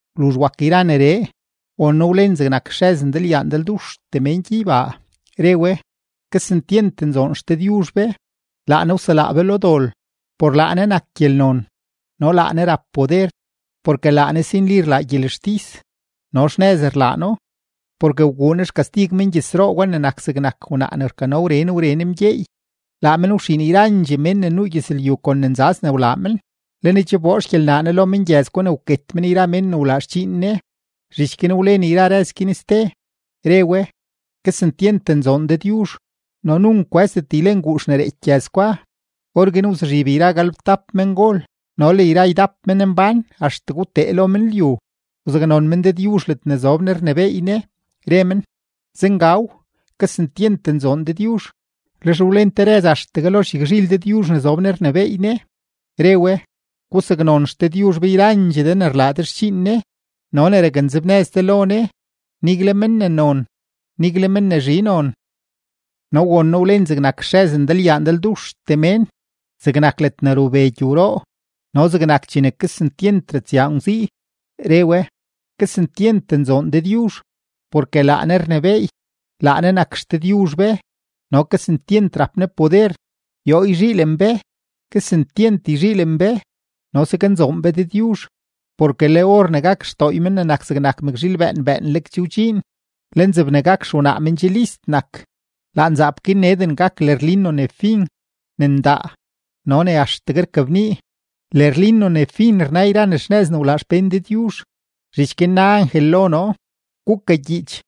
Wluzh wak yra neree, won noo wlen zegnak xrëz ndalyaa ndalduxtee mén gyeybaa, re we: ¡Kesentyent nzoon XDëdyuzh be! Laa Ne wselaa be lo dol. Por laa Ne nak gyelnon no laa Ne rap poder. Porke laa Ne si nli rlaa gyelextis no xnëz rlaa No, porke wguu Ne xkastig mengyëzroo gwa ne wak zegnak wnaa ne rkano wren wren mgyeey. Laa men wxiin yrandxee mén ne nuu gyëzlyu kon ne nzaz ne wlaa men; le Ne che wboo xgyelnaa lo mengyëz gwa ne wket men yra mén ne wlaa xdxiin Ne. Zhich guin wlen yra rëz guin ste, re we: ―¡Kesentyent nzoon Dëdyuzh! No nunk kwë́zdet ylen guux ne reeky gyëz gwa. Orguin wzuzhib yra galebtap mengol no le yra ydap menmbán axtegue wtee lo men lyu, wzaknon men Dëdyuzh ledne zob Ne rnebééy Ne, re men: ―¡Zengaw! ¡Kesentyent nzoon Dëdyuzh! Lex wlen te rëz axtegue lo xyagzhil Dëdyuzh ne zob Ne rnebééy Ne, re we: Gusaknon XDëdyuzh be yrandxee de ne rlaa de xdxiin Ne no ne raknzebnëz de lo Ne, nigle men ne non, nigle men ne zhi non. No won noo wlen zegnak xrëz ndalyaa ndalduxtee mén, zegnak ledne rube gyowroo no zegnak chene kesentyent ratsyaa ngwzii, re we: ¡Kesentyent nzoon Dëdyuzh! Porke laa Ne rnebééy; laa Ne nak XDëdyuzh be no kesentyent rap Ne poder. Yoo yzhiilen be, kesentyent yzhiilen be no saknzoon be Dëdyuzh, porke le or ne gak xdooy Men ne nak zegnak mëkzhiil bëën bëënleg che wdxiin. Le nzeb ne gak xewnaa men che list nak. Laa nzaap guin neden gak lërlino ne fin, ne ndaa no ne axtegue rkabnii. Lërlino ne fin rna yra ne xnëz ne wlaa xpén Dëdyuzh. Zhich guin na angel lo noo: ―Gukagyiich: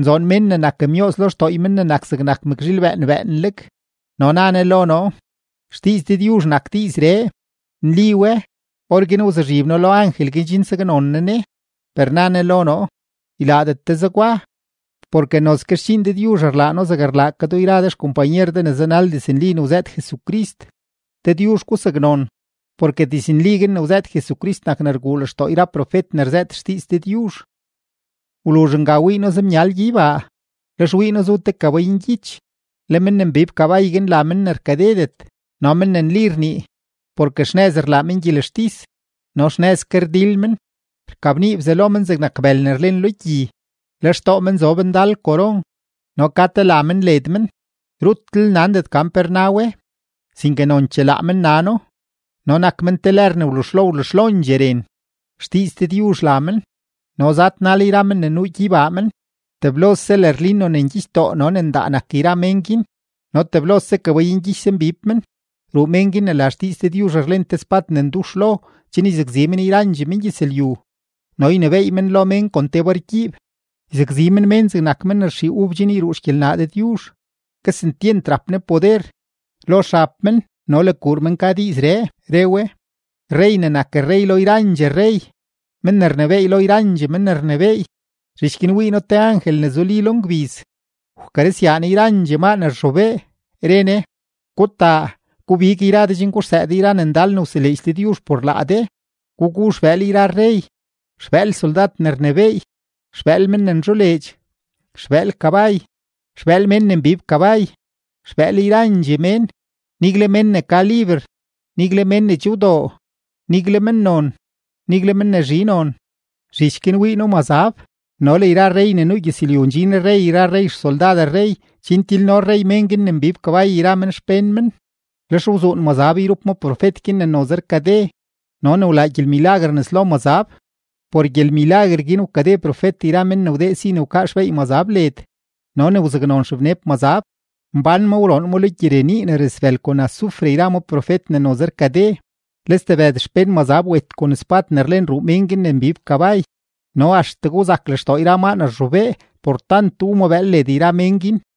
“Nzoon mén ne nak myooz lo xdooy Men ne nak zegnak mëkzhiil bëën bëënleg.” No na ne lo noo: ―Xdiiz Dëdyuzh nak diizree, nli we. Orguin wzuzhib noo lo angel guin chen saknon noo ne, per na ne lo noo: ―Ylaadet de zegwa, porke nozke xdxiin Dëdyuzh rlaa noo zegne rlaa ke do yra de xkompanyer de ne zanal diznli ne wzëët Jesucrist. Dëdyuzh gusaknon. Porke diiz guin ne wzëët Jesucrist nak ne rguu lextoo yra profet ne rzëët xdiiz Dëdyuzh. Wluzh nga wii noo zemyal gyeybaa, lex wii noo zu te kabay ngyich. Le men ne mbib kabay guin la Men ne rkadedet no Men ne nli rnii, porke xnëz rlaa men gyelextis no xnëz ke rdil men. Rkabnii bzalo men zegnak bël ne rlen lo gyi, le xtoo men zob ndal koron, no ka te la men led men; rutlel nandet gan pe rna we, sinke nonchee laa men nano. No nak men te lër ne wluzhlo wluzhlondxee ren. XDiiz Dëdyuzh la men. No zadnal yra men ne nuu gyeybaa men; teblose lërlino ne ngyichdoo no ne ndaa nak yra men guin no teblose kabay ngyich zambib men. Ruu mén guin ne la Xdiiz Dëdyuzh rlen te spad ne ndux lo chen yzakzi men yra mengyëzlyu no ynebééy men lo mén kon te bargyiib. Yzakzi men mén zegnak men ne rxii ub chen yruu xgyelnaa Dëdyuzh. Kesentyent rap Ne poder. Lo xab men no le kuur men ka: “Rrey ne nak rrey lo yrandxee rrey, Men ne rnebééy lo yrandxee men ne rnebééy.” Zhich guin wii noo te angel ne zuli lo ngbiz, wkarëzyaa ne yrandxee maa ne rzhobee, re ne: ―Gutaa, gubig yra de chen guxsëë de yra ne ndal ne wseleedx Dëdyuzh por laa de. Gugu xbëël yra rrey, xbëël soldad ne rnebééy, xbëël men ne nzholeedx, xbëël kabay, xbëël mén ne mbib kabay, xbëël yrandxee mén, nigle mén ne ka liber, nigle mén ne che wdoo, nigle mennon, nigle men ne zhi non. Zhich guin wii noo mazab no le yra rrey ne nuu gyëzlyu ndxin rrey yra rrey xsoldad rrey chen tilno rrey mén guin ne mbib kabay yra men xpén men. Lex wzuun mazab yrup ma profet guin ne noze rkade no ne wlaa gyelmilaguer nes lo mazab; por gyelmilaguer guin wkade profet yra mén ne wdee si wkaa xbeey mazab led no ne wzaknon xebneb mazab. Mbán ma wroon ma lo gyirenii ne rasbël kon azufre yra ma profet ne noze rkade. Le stebëd xpén mazab wet kon spad ne rlen ruu mén guin ne mbib kabay, no axtegue wzak lextoo yra maa ne rzhobee por tant wu ma bëël led yra mén guin.